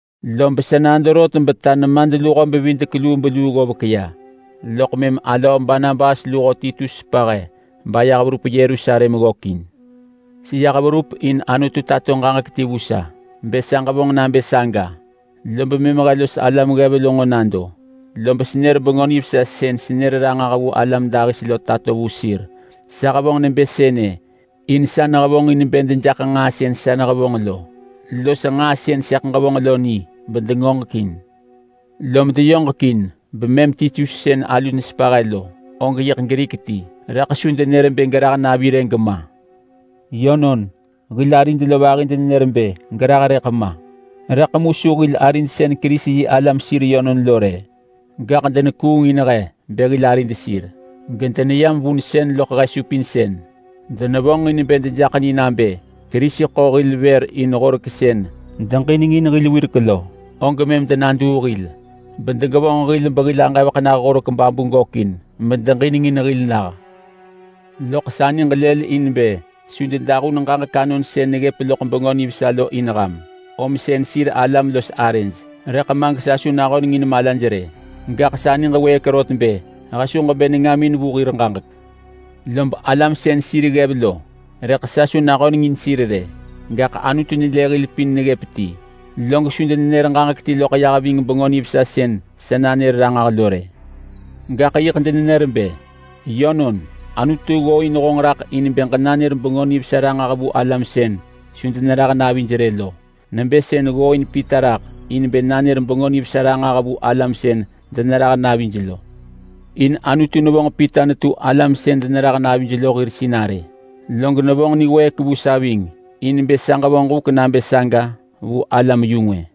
Lob sa nado rot beta nemadluho-bevidek-lubeluu ggovek ya, loḳ mëm alöö Barnabas luho Titus sepa he bayah verup Yerusalem ggökin. Seyah verup in Anutu tato ġaġek ti vu sa bë sa ġevonġ nabë saga. Lob mëm he los alam ggev lo nġo nado, lob senër Bengö Nivesa sën senër ranġah vu alam dahis lo tato vu sir. Sa hevonġ nebë sënë in sa nehevonġin bë dejaḳ nġaa sën sa nehevonġ lo los nġaa sën sëḳ ġevonġ lo ni bedengoġekin. Lom deyoġekin bemëm Titus sën alu nesepa he lo, og yi Grik ti rëḳ su denër bë gerah navi rë gema! Yönon, hil arid lo vahi denenër bë gerah rëḳ ma. Rëḳ mu su hil arid sën Kerisi-yi-alam sir yönon lo rë, gaḳ denekuungin he bë hil arid sir gedeneyam vunsën loḳ he supinsën. Denevonġin bë dejaḳ ni nabë Kerisi ḳo hil vër in Horek sën deġinengin hil wirek lo, og mëm denaduu hil bedegevonġ hil behil aġevek Horek babu gökin medeġinengin hil nah. Loḳ sa niġ lëlin bë su dedahun ġaġek anon sën neggëp loḳ Bengö Nivesa lo in ham, om sën sir alam los arëj rëḳ ma gesa su nahöneng in malaj rë. Gaḳ sa niġ wëëk rot bë he su ġebë nengamin vu hir ġaġek. Lob alam sën arëj neggëp nebë sir ggev lo, rëḳ sa su nahöneng in sir in sir alam ggev rë. Gaḳ Anutu nelë hil pin neggëp ti og su denenër ġaġek ti ya ving Bengö Nivesa sën sa nanër ranġah lo rë. Gaḳ yiḳ denenër bë, “Yönon, Anutu ggooin honġ raḳ in bë ġenanër Bengö Nivesa ranġah vu alam sën su denerah navij rë lo. Nebë sën ggooin Pita raḳ in bë nanër Bengö Nivesa ranġah vu alam sën denerah navij lo.” In Anutu nevonġ Pita netu alam sën denerah navij lo hir sinarë, log nevonġ niwëëk vu sa ving in bë sa ġevonġ huk nabë saga vu alam-yu-ngwë.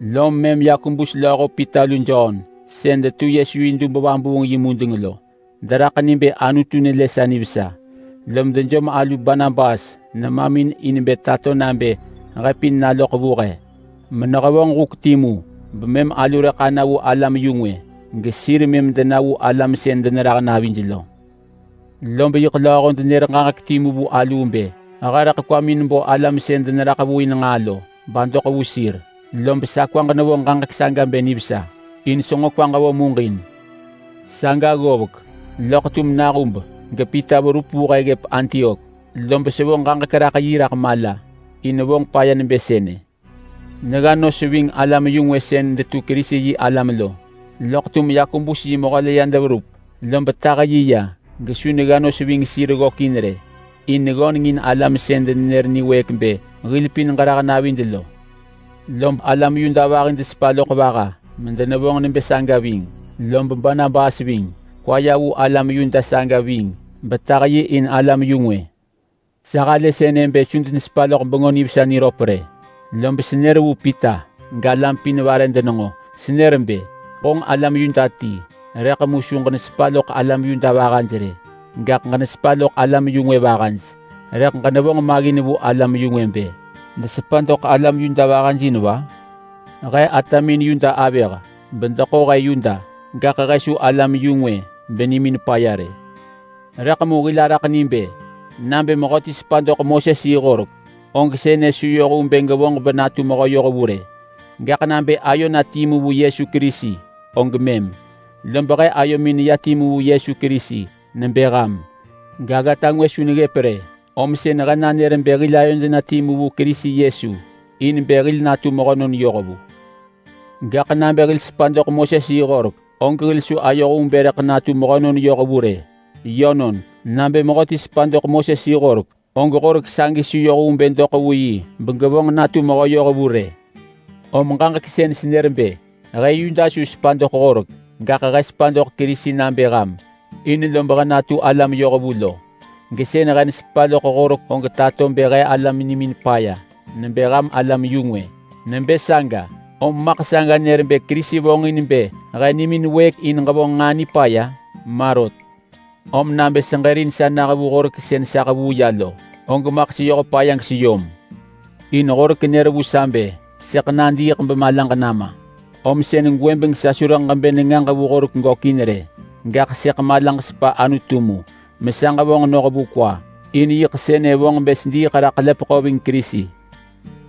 Lom mëm Yakobus lööho Pita lu Jon sën detu Yesu yi dub vabuung yi mudeng lo, deraḳ ni bë Anutu nelë sa nivesa. Lom dejom alu Barnabas nemamin in bë tato nabë he pin naloḳ vu he menehevonġ huk timu bemëm alu rëḳ ana vu alam-yu-ngwë. Gesir mëm dena vu alam sën denerah navij lo. Lob yiḳ lööho denër ġaġek timu vu aluu bë he rëḳ kwamin bo alam sën deneraḳ vu in nġaa lo badoḳ vu sir, lob sa kwaġ nevo ġaġek saga bë nivesa in senġo kwaġ vo muġin. Saga ggovek, loḳ tum nahub gePita verup vu he ggëp Antiok lob sa hevonġ ġaġek raḳ yi raḳ mala, in vonġ paya nebë sënë. Negga nos ving alam-yu-ngwë sën detu Kerisi-yi-alam lo. Loḳ tum Yakobus yi mehö la ya deverup, lob tah yi ya gesu negga nos ving sir ggökin rë in neggöneng in alam sën denenër niwëëk bë hil pin gerah navid lo. Lob alam Yuda vahi desepa loḳ vaha medenevonġ nebë saga ving, lob Barnabas ving. Kwa ya vu alam Yuda saga ving betah yi in alam-yu-ngwë. Sa halë sënë bë su denesepa loḳ Bengö Nivesa niröp rë, lob senër vu Pita galam pin vare denenġo. Senër bë, “Honġ alam Yuda ti rëḳ mu su ġenesepa loḳ alam Yuda vahaj rë, gaḳ ġenesepa loḳ alam-yu-ngwë vahaj. Rëḳ ġenevonġ maggin vu alam-yu-ngwë bë desepa doḳ alam Yuda vahaj in va?” He atamin Yuda bedeḳo he Yuda, gaḳ he su alam-yu-ngwë benimin paya rë. Rëḳ mu hil araḳ ni bë nabë mehöti sepa doḳ Moses-yi-horek, og sënë su yoh vu bë gevonġ benatu mehö yohvu rë, gaḳ nabë ayo na timu vu Yesu Kerisi og mëm. Lob he ayomin neya timu vu Yesu Kerisi nebë ham, gaggata ngwë su neggëp rë, om sën he nanër bë hil ayod na timu vu Kerisi Yesu in bë hil natu mehönon yohvu. Gaḳ nabë hil sepa doḳ Moses-yi-horek, og hil su ayoh vu bë rëḳ natu mehönon yohvu rë. Yönon, nabë mehöti sepa doḳ Moses-yi-horek, og horek sagi su yoh vu bë doḳ vu yi begevonġ yi natu mehö yohvu rë. Om ġaġek sën senër bë he Yuda su sepa doḳ Horek, gaḳ he sepa doḳ Kerisi nabë ham in he natu alam yohvu lo, og saga tato bë he alam nimin paya nebë ham alam-yu-ngwë. Nebë saga, om maḳ saga nër bë Kerisi vonġin bë hil sepa doḳ nġaa nipaya? Ma rot! Om nabë seġërin sa nah vu Horek sën sa hevuu ya lo, og maḳ seyoh paya geseyom. In Horek nër sa bë sëḳ nadiiḳ bemalaġ nama, om sën gwëbeng sa su rëḳ ġebë nengaġ vu Horek gökin rë. Gaḳ sëḳ malaġ sepa Anutu mu mesa ġevonġ noh vu kwa. In yiḳ sënë vonġ bë sediiḳ raḳ ḳelepeḳo ving Kerisi,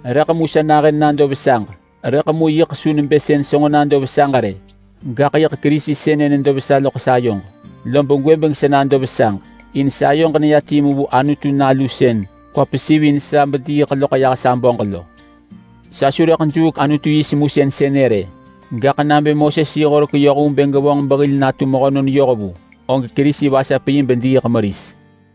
rëḳ ma gesa nahën nado vesaġ. Rëḳ mu yiḳ su nebë sën senġo nado vesaġ rë. Gaḳ yiḳ Kerisi sënë nedo vesa loḳ sayoġ lob gwëbeng sa nado vesaġ, in sayoġ neya timu vu Anutu Nalu sën kwa pesivin sa bediiḳ loḳ yah sa böġ lo. Sa su rëḳ juuk Anutu yi semusën sënë rë, gaḳ nabë Moses-yi-horek yoh vu bë gevonġ behil natu mehönon yohvu, og Kerisi vasap yi bediiḳ meris.